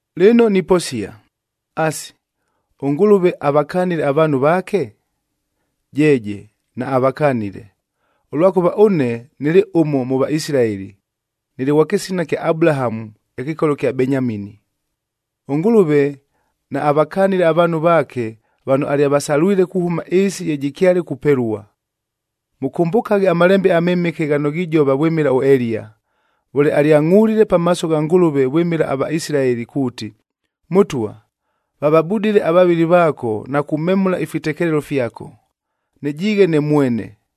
Lɨno niposia, asi, ʉNgʉlʉve avakanile avaanhu vaake? Jeeje naavakanile, ʉlwakʉva ʉne nɨlɨ ʉmo mʉ Vaisilaeli, nɨlɨ ghwa kɨsina kya Abulahamu, ɨkɨkolo kya Benyamini. ɄNgʉlʉve naavakanile avaanhu vaake vano alyavasalwile kuhʉma ɨɨsi ye jɨkyale kupelua. Mʉkʉmbʉkaghe aMalembe aMɨmɨke ghano ghijova vwɨmɨla ʉEliya, vʉle alyangʼulile pamaaso gha Ngʉlʉve vwɨmɨla aVaisilaeli kuuti, “Mʉtwa, vavabudile avavɨli vaako na kumemʉla ifitekelelo fyako. Nɨjiighe ne mwene,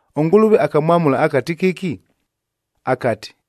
ɄNgʉlʉve akamwamʉla akati kɨki? Akati,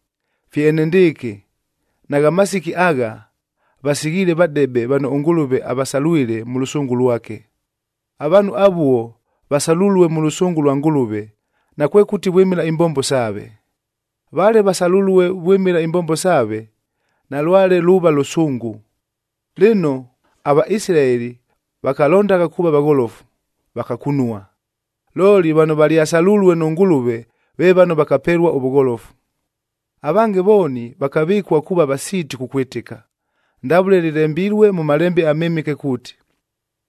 Fye enendɨɨkɨ nagha masiki agha, vasighiile vadebe vano ʉNgʉlʉve avasalwile mʉ lʉsʉngʉ lwake. Avaanhu avuo vasalulue mʉ lʉsʉngʉ lwa Ngʉlʉve, nakwekʉti vwɨmɨla imbombo saave. Vale vasalʉlue vwɨmɨla imbombo saave, nalwale luuva lʉsʉngʉ. Lɨno, aVaisilaeli vakalondagha kuuva vagholofu, vakakunua. Looli vano valyasalulue nʉ Ngʉlʉve ve vano vakapelua ʉvʉgholofu. Avange vooni vakavɨkua kuuva vasiiti kukwɨtɨka. Ndavʉle lɨlembilue mʉ Malembe aMɨmɨke kuuti,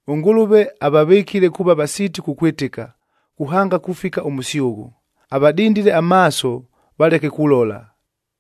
“ɄNgʉlʉve avavɨkile kuuva vasiiti kukwɨtɨka, kuhanga kufika ʉmʉsyʉghʉ. Avadindile amaaso valeke kulola,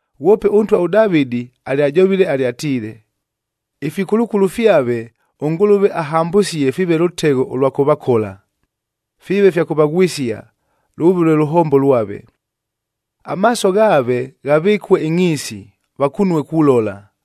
Ghwope ʉntwa ʉDavɨdi alyajovile alyatiile, “Ifikulukulu fyave ʉNgʉlʉve ahambʉsie fiive lʉtegho ʉlwa kʉvakola, fiive fya kʉvaghwɨsia, lʉʉve lwe lʉhombo lwave. Amaaso ghaave ghavɨkue ɨngʼhiisi, vakunue kulola,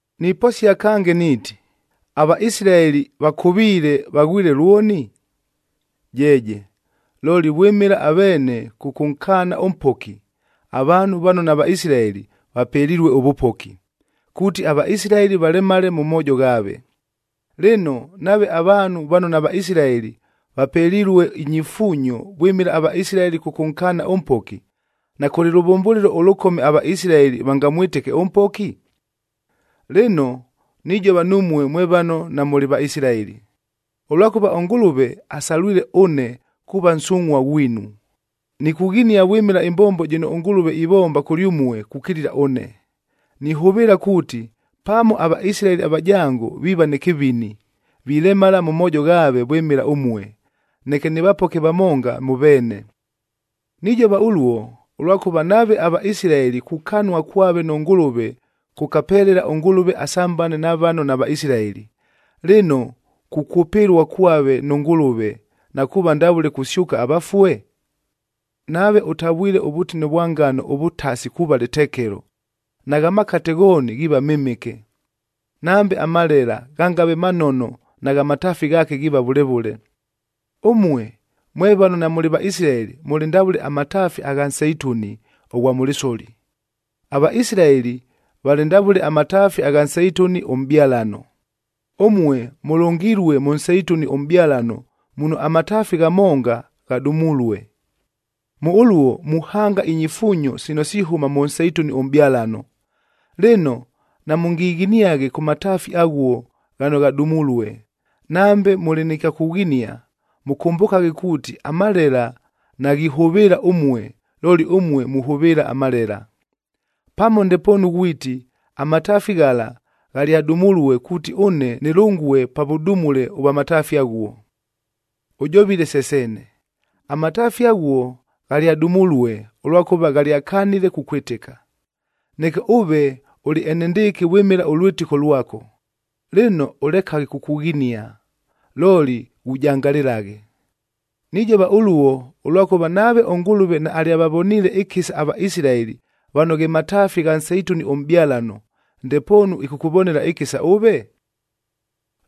Niposia kange niiti, aVaisilaeli vakʉviile, vaghwile lwoni? Jeeje! Looli vwɨmɨla aveene kʉkʉnkaana ʉMpoki, avaanhu vano naVaisilaeli vapelilue ʉvʉpoki, kuuti aVaisilaeli valemale mʉ moojo ghaave. Lɨno, nave avaanhu vano naVaisilaeli vapelilue inyifuunyo vwɨmɨla aVaisilaeli kʉkʉnkaana ʉMpoki, nakʉlɨ lʉvʉmbʉlɨlo ʉlʉkome aVaisilaeli vangamwɨtɨke ʉMpoki? Lɨno, nijova numue mwe vano namʉlɨ Vaisilaeli. Ʉlwakʉva ʉNgʉlʉve asalwile ʉne kuuva nsungʼhua ghwinu, nikughinia vwɨmɨla ɨmbombo jɨno ʉNgʉlʉve ivomba kʉlyʉmue kukilila ʉne. Nihʉvɨɨla kuuti, pamo aVaisilaeli avajango viiva nɨ kɨvini, vilemala mʉ moojo ghaave vwɨmɨla ʉmue, neke nɨvapoke vamonga mʉ veene. Nijova ʉluo, ʉlwakʉva nave aVaisilaeli kukanua kwave nʉ Ngʉlʉve kʉkapelela ʉNgʉlʉve asambane na vano naVaisilaeli, lɨno kukwʉpɨlua kwave nʉ Ngʉlʉve na kuuva ndavʉle kusyʉka avafue? Nave ʉtavwile ʉvʉtine vwa ngano ʉvʉtasi kuuva lɨtekelo, nagha makate ghooni ghiiva mɨmɨke. Nambe amalela ghangave manono nagha mataafi ghaake ghiiva vʉle vʉle. Ʉmue mwe vano namʉlɨ Vaisilaeli mʉlɨ ndavʉle amataafi agha nseituni ʉghwa mʉ lɨsoli. AVaisilaeli valɨ ndavʉle amataafi agha nseituni ʉmʼbyalano. Ʉmue mʉlʉngilue mʉ nseituni ʉmʼbyalano muno amataafi ghamonga ghadumulue. Mʉ ʉluo muhanga inyifuunyo sino sihʉma mʉ nseituni ʉmʼbyalano. Lɨno, namʉngighiniaghe kʉ mataafi aghuo ghano ghadumulue. Nambe mʉlɨ nɨ kya kughinia, mʉkʉmbʉkaghe kuuti amalela naghihʉvɨɨla ʉmue looli ʉmue muhʉvɨɨla amalela. Pamo ndepoonu ghwiti, “Amataafi ghala ghalyadumulue kuuti ʉne nɨlʉngue pa vʉdumule ʉvwa mataafi aghuo.” Ʉjovile se seene. Amataafi aghuo ghalyadumulue ʉlwakʉva ghalyakanile kukwɨtɨka, neke ʉve ʉlɨ enendɨɨkɨ vwɨmɨla ʉlwɨtɨko lwako. Lɨno, ʉlekaghe kukughinia, looli ghujangalɨlaghe. Nijova ʉluo, ʉlwakʉva nave ʉNgʉlʉve naalyavavoniile ɨkɨsa aVaisilaeli vano ghe mataafi gha nseituni ʉmʼbyalano, ndepoonu ɨkʉkʉvonela ɨkɨsa ʉve?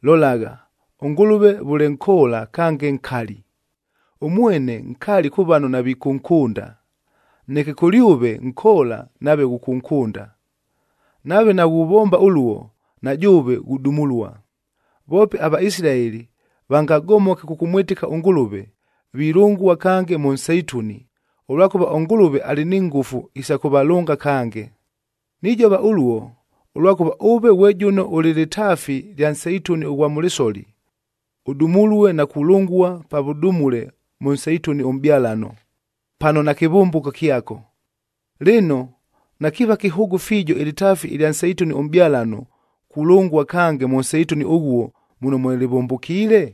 Lolagha, ʉNgʉlʉve vʉle nkoola kange nkali. Ʉmwene nkali kʉ vano navikʉnkʉnda, neke kʉlyʉve nkoola nave ghʉkʉnkʉnda. Nave naghuvomba ʉluo, na jʉʉve ghudumulua. Voope aVaisilaeli vangagomoke kʉkʉmwɨtɨka ʉNgʉlʉve, vilʉngua kange mʉ nseituni, ʉlwakʉva ʉNgʉlʉve alɨ ni ngʉfu isa kʉvalʉnga kange. Nijova ʉluo, ʉlwakʉva ʉve ghwe jʉno ʉlɨ lɨtaafi lya nseituni ʉghwa mʉ lɨsoli, ʉdumulue na kulʉngua pa vʉdumule mʉ nseituni ʉmʼbyalano pano nakɨvʉmbʉko kyako. Lɨno, nakiiva kɨhʉʉgʉ fiijo ɨlɨtaafi ɨlya nseituni ʉmʼbyalano, kulʉngua kange mʉ nseituni ʉghuo muno mwe lɨvʉmbʉkiile?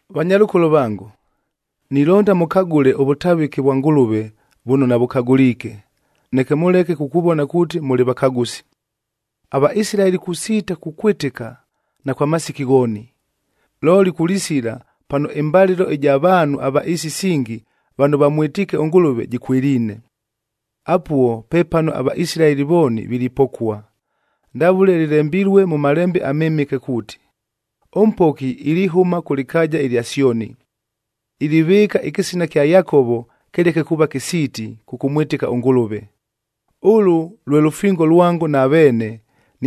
Vanyalʉkolo vango, nilonda mʉkagʉle ʉvʉtavɨke vwa Ngʉlʉve vʉno navʉkagʉliike, neke mʉleke kukuvona kuuti mʉlɨ vakagʉsi. AVaisilaeli kusiita kukwɨtɨka, na kwa masiki ghooni, looli kulisila pano ɨmbalɨlo ɨja vaanhu ava ɨɨsi isingi vano vamwɨtiike ʉNgʉlʉve jɨkwɨliine. Apuo pepano aVaisilaeli vooni vilipokua. Ndavʉle lɨlembilue mʉ Malembe aMɨmɨke kuuti, “ɄMpoki ilihʉma kʉ lɨkaaja ɨlya Syoni, ilivɨɨka ɨkɨsina kya Yakovo kɨleke kuuva kɨsiiti kʉkʉmwɨtɨka ʉNgʉlʉve. Ʉlʉ lwe lʉfingo lwango na veene,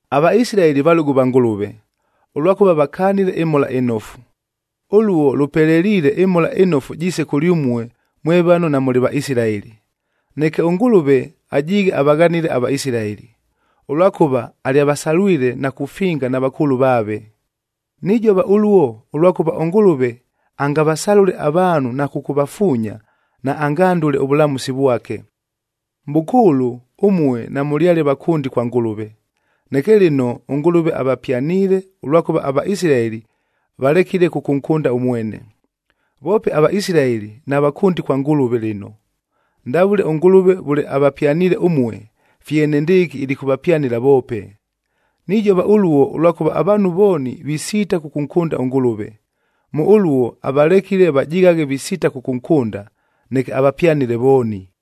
AVaisilaeli valʉgʉ va Ngʉlʉve, ʉlwakʉva vakanile ɨMhola ɨNofu. Ʉluo lʉpeleliile ɨMhola ɨNofu jiise kʉlyʉmue mwe vano namʉlɨ Vaisilaeli. Neke ʉNgʉlʉve ajiighe avaghanile aVaisilaeli, ʉlwakʉva alyavasalwile na kufinga na vakʉʉlʉ vaave. Nijova ʉluo, ʉlwakʉva ʉNgʉlʉve angavasalʉle avaanhu na kʉkʉvafuunya, naangandʉle ʉvʉlamʉsi vwake. Mʼbʉkʉʉlʉ ʉmue namʉlyale vakʉndi kwa Ngʉlʉve, neke lɨno ʉNgʉlʉve avapyaniile ʉlwakʉva aVaisilaeli valekile kʉkʉnkʉnda ʉmwene. Voope aVaisilaeli navakʉndi kwa Ngʉlʉve lɨno. Ndavʉle ʉNgʉlʉve vʉle avapyaniile ʉmue, fye enendɨɨkɨ ilikʉvapyanɨla voope. Nijova ʉluo, ʉlwakʉva avaanhu vooni visiita kʉkʉnkʉnda ʉNgʉlʉve. Mʉ ʉluo avalekile vajighaghe visiita kʉkʉnkʉnda, neke avapyanɨle vooni.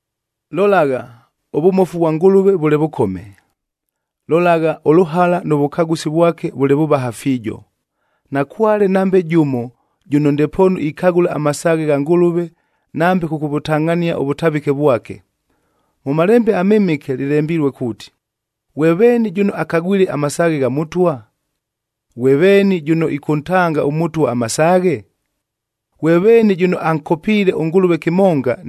Lolagha, ʉvʉmofu vwa Ngʉlʉve vʉle vʉkome! Lolagha, ʉlʉhala nʉ vʉkagʉsi vwake vʉle vʉvaha fiijo! Nakwale nambe jʉmo jʉno ndepoonu ikagʉla amasaaghe gha Ngʉlʉve nambe kʉkʉvʉtangʼhania ʉvʉtavɨke vwake. Mʉ Malembe aMɨmɨke lɨlembilue kuuti, “Ghwe veeni jʉno akagwile amasaaghe gha Mʉtwa? Ghwe veeni jʉno ɨkʉntanga ʉMʉtwa amasaaghe?” “Ghwe veeni jʉno ankopiile ʉNgʉlʉve kɨmonga,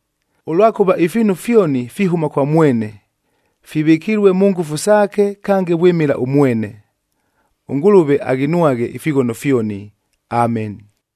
Ʉlwakʉva ifiinu fyoni fihʉma kwa mwene, fivɨkilue mʉ ngʉfu saake, kange vwɨmɨla ʉmwene. ɄNgʉlʉve aghinwaghe ifighono fyoni! Ameni.